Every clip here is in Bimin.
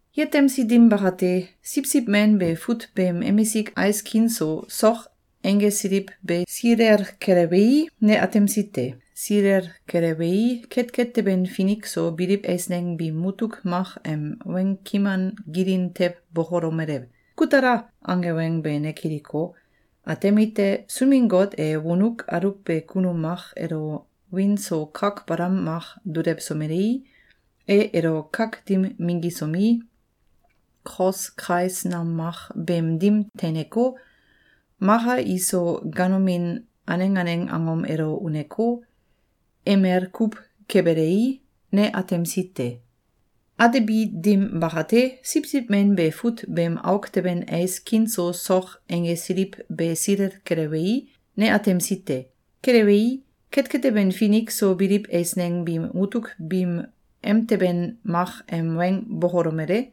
Yetemsi dim bakate, Siwsiw Men be fut beem emisik ais kin so sok einggesiliw be silel kelewei, ne atemsi te. Silel kelewei, ketket teben finik so biliw eisneng biim mutuk mak em weng kiman gilin tew bokolomele: “Ku tala!”, ange weng be ne kiliko, atemite: Sunbin-Got e wonuk aluwbe kunum mak elo wiin so kak balam mak dulewsomelei, e elo kak dim minggisomi, kos kais nam mak beem dim teineko, maka iso ganomin aneng aneng angom elo uneko, emel kuw kebelei, ne atemsi te. Atebi dim bakate, Siwsiw Men be fut beem auk teben ais kin so sok einggesiliw be silel kelewei, ne atemsi te. Kelewei, ketket teben finik so biliw eisneng biim mutuk biim emteben mak em weng bokolomele: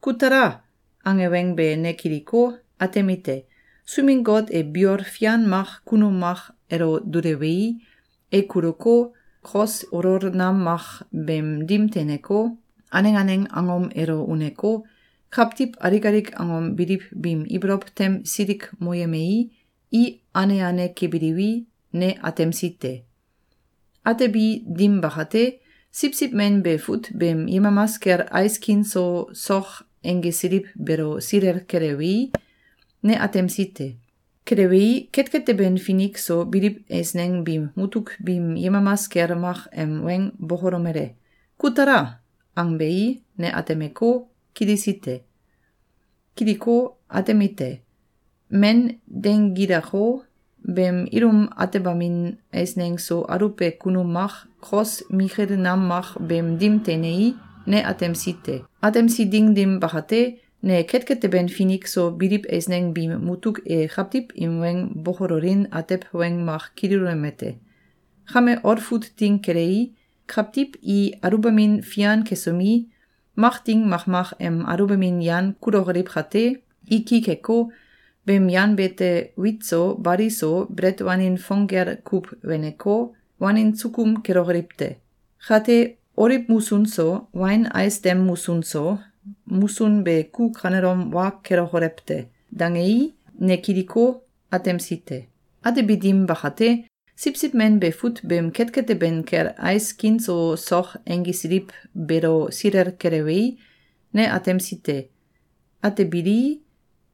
“Ku tala!”, ange weng be ne kiliko, atemite: Sunbin-Got e biol fian mak kunum mak elo dulewei, e kuluko, kos olol nam mak beem dim teineko, aneng aneng angom elo uneko, kawtiw alik alik angom biliw biim ibolow tem silikmoyemei, i ane ane kebiliwi, ne atemsi te. Atebi dim bakate, Siwsiw Men be fut beem yemamas kel ais kin so sok einggesiliw beelo silel kelewei, ne atemsi te. Kelewei, ketket teben finik so biliw eisneng biim mutuk biim yemamas kel mak em weng bokolomele: “Ku tala!”, angbei, ne atemeko, kilisi te. Kiliko, atemite: Men deinggilako, beem ilum atembamin eisneng so aluwbe kunum mak, kos mikil nam mak beem dim teinei, ne atemsi te. Atemsi ding dim bakate, ne ketket teben finik so biliw eisneng biim mutuk e kawtiw im weng bokololin atew weng mak kililomete: “Kame olfut ding kelei, kawtiw i aluwbamin fian kesomi, mak ding makmak em aluwbamin yan kulokoliw kate, i ki keko, beem yan beete wit so bali so, belet wanin fong gel kuw weneko, wanin sukum kelokoliw te! Kate, oliw musun so, wain ais dem musun so, musun be ku kanelom wa kelokolew te!”, dangei, ne kiliko, atemsi te. Atebi dim bakate, Siwsiw Men be fut beem ketket teben kel ais kin so sok einggesiliw beelo silel kelewei, ne atemsi te. Atebilii,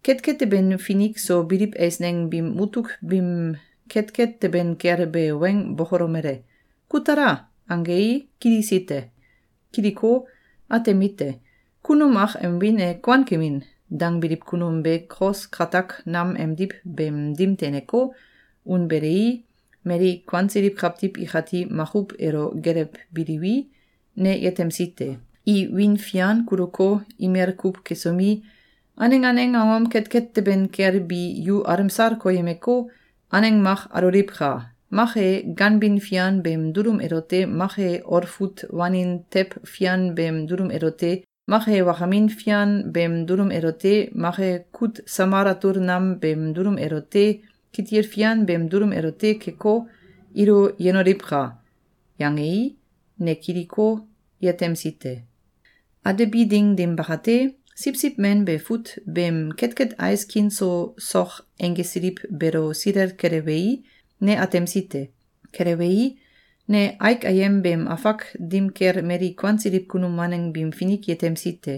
ketket teben finik so biliw eisneng biim mutuk biim ketket teben kel be weng bokolomele: “Ku tala!”, angei, ne kilisi te. Kiliko, atemite: Kunum mak em wiin e “Kuankemin!”, dangbiliw kunum be kos katak nam emdiw beem dim teineko, unbelei, mali kuansiliw kawtiw ikati makuw elo gelewbiliwi, ne yetemsi te. I wiin fian kuluko, imel kuw kesomi, “Aneng aneng angom ketket teben kel bi yu alemsal koyemeko, aneng mak aloliwka! Mak e, ganbin fian beem dulum elote mak e olfut wanin tew fian beem dulum elote mak e wakamin fian beem dulum elote mak e kut samal atul nam beem dulum elote kitil fian beem dulum elote keko, ilo yenoliwka!”, yangei, ne kiliko, yetemsi te. Atebi ding dim bakate, Siwsiw Men be fut beem ketket ais kin so sok einggesiliw beelo silel kelewei, ne atemsi te. Kelewei, ne aik ayem beem afak dim kel mali kuansiliw kunum waneng biim finik yetemsi te.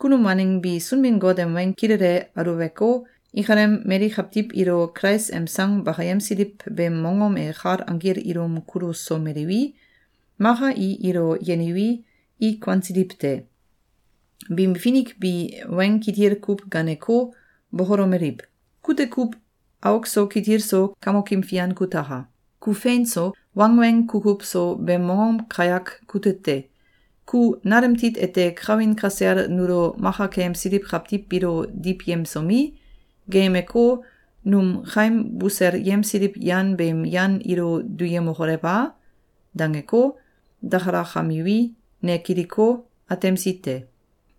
Kunum waneng bi Sunbin-Got em weng kilele aluweko, ikalem mali kawtiw ilo Kulais em sang bakayemsiliw beem mongom e kal anggil ilum kulusomeliwi, maka i ilo yeniwi, i kuansiliw te. Biim finik bi weng kitil kuw gaaneko, bokolomeliw: “Kute kuw auk so kitil so Kamokim Fian kutaka! Ku fein so, wangweng kukuw so beem mongom kayak kute te! Ku nalem tit ete kawin kasel nulo maka keyemsiliw kawtiw biilo diwyemsomi, geeyemeko, num kaim buselyemsiliw yan beem yan ilo duyemokolew a?”, dangeko, dakalakamiwi, ne kiliko, atemsi te.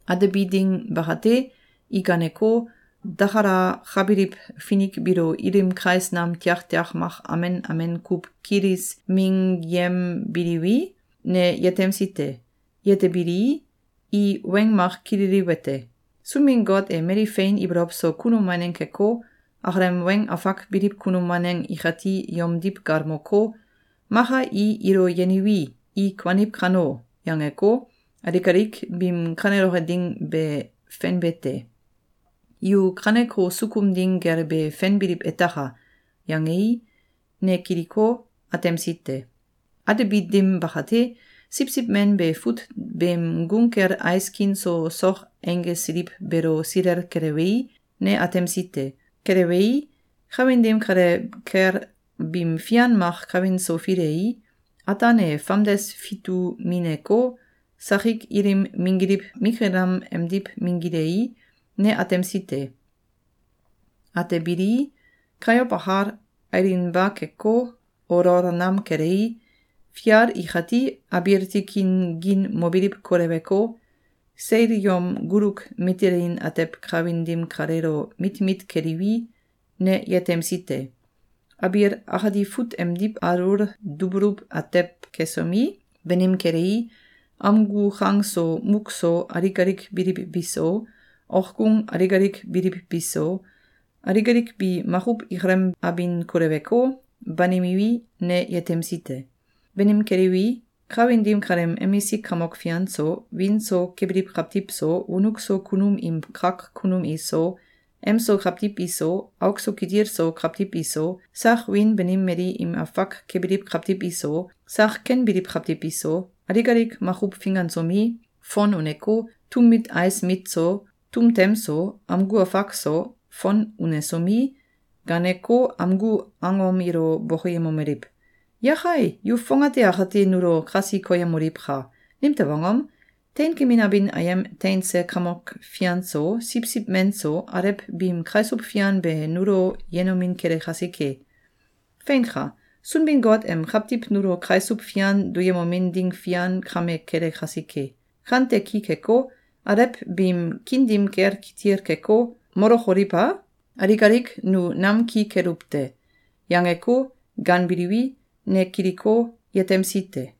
Atebi ding bakate, i gaaneko, dakalakabiliw finik biilo ilim kais nam tiaktiak mak amen amen kuw kilis minggyembiliwi, ne yetemsi te. Yetebilii, i weng mak kililiwete: “Sunbin-Got e mali fein ibolow so kunum waneng keko, akalem weng afak biliw kunum waneng ikati yomdiw galmoko, ‘Maka i ilo yeniwi, i kuaniw kano!’, yangeko, alik alik biim kaneloke ding be fenbe te. Yu kaneko sukum ding gel be fenbiliw etaka!”, yangei, ne kiliko, atemsi te. Atebi dim bakate, Siwsiw Men be fut beem gung kel ais kin so sok einggesiliw beelo silel kelewei, ne atemsi te. Kelewei, kawin dim kale kel bim fian mak kawin so filei, ataan e famdes fitumineko, sakik ilim minggiliw mikil nam emdiw minggilei, ne atemsi te. Atebilii, kayow akal, ailinba keko, olol nam kelei, fial ikati abiil tikin gin mobiliw koleweko, seil yom guluk mitelin atew kawin dim kaleelo mit mit keliwi, ne yetemsi te. Abiil akati fut emdiw alul dubuluw atew kesomi, banim kelei, amgu kang so muk so alik alik biliw biso, okgung alik alik biliw biso, alik alik bi makuw ikalem abin koleweko, banimiwi, ne yetemsi te. Banim keliwi, kawin dim kaleem emisik kamok fian so, wiin so kebiliw kawtiw so, wonuk so kunum im kak kunum iso, emso kawtiw iso, auk so kitil so kawtiw iso, sak wiin banim mali im afak kebiliw kawtiw iso, sak ken biliw kawtiw iso, alik alik makuw fingansomi, fon uneko, tum mit ais mit so, tum tem so, amgu afak so, fon unesomi, gaaneko, amgu angom ilo bokoyemomeliw: “Yakai! Yu fongate akate nulo kasi koyemoliwka! Nimtew angom? Teinkemin abin ayem teinse Kamok Fian so, Siwsiw Men so, alew biim kaisuw fian be nulo yenomin kele kasike! Feinka! Sunbin-Got em kawtiw nulo kaisuw fian duyemomin ding fian kame kele kasike! Kante ki keko, alew biim kiin dim kel kitil keko, molokoliw a? Alik alik nu nam ki keluw te!”, yangeko, gaanbiliwi, ne kiliko, yetemsi te.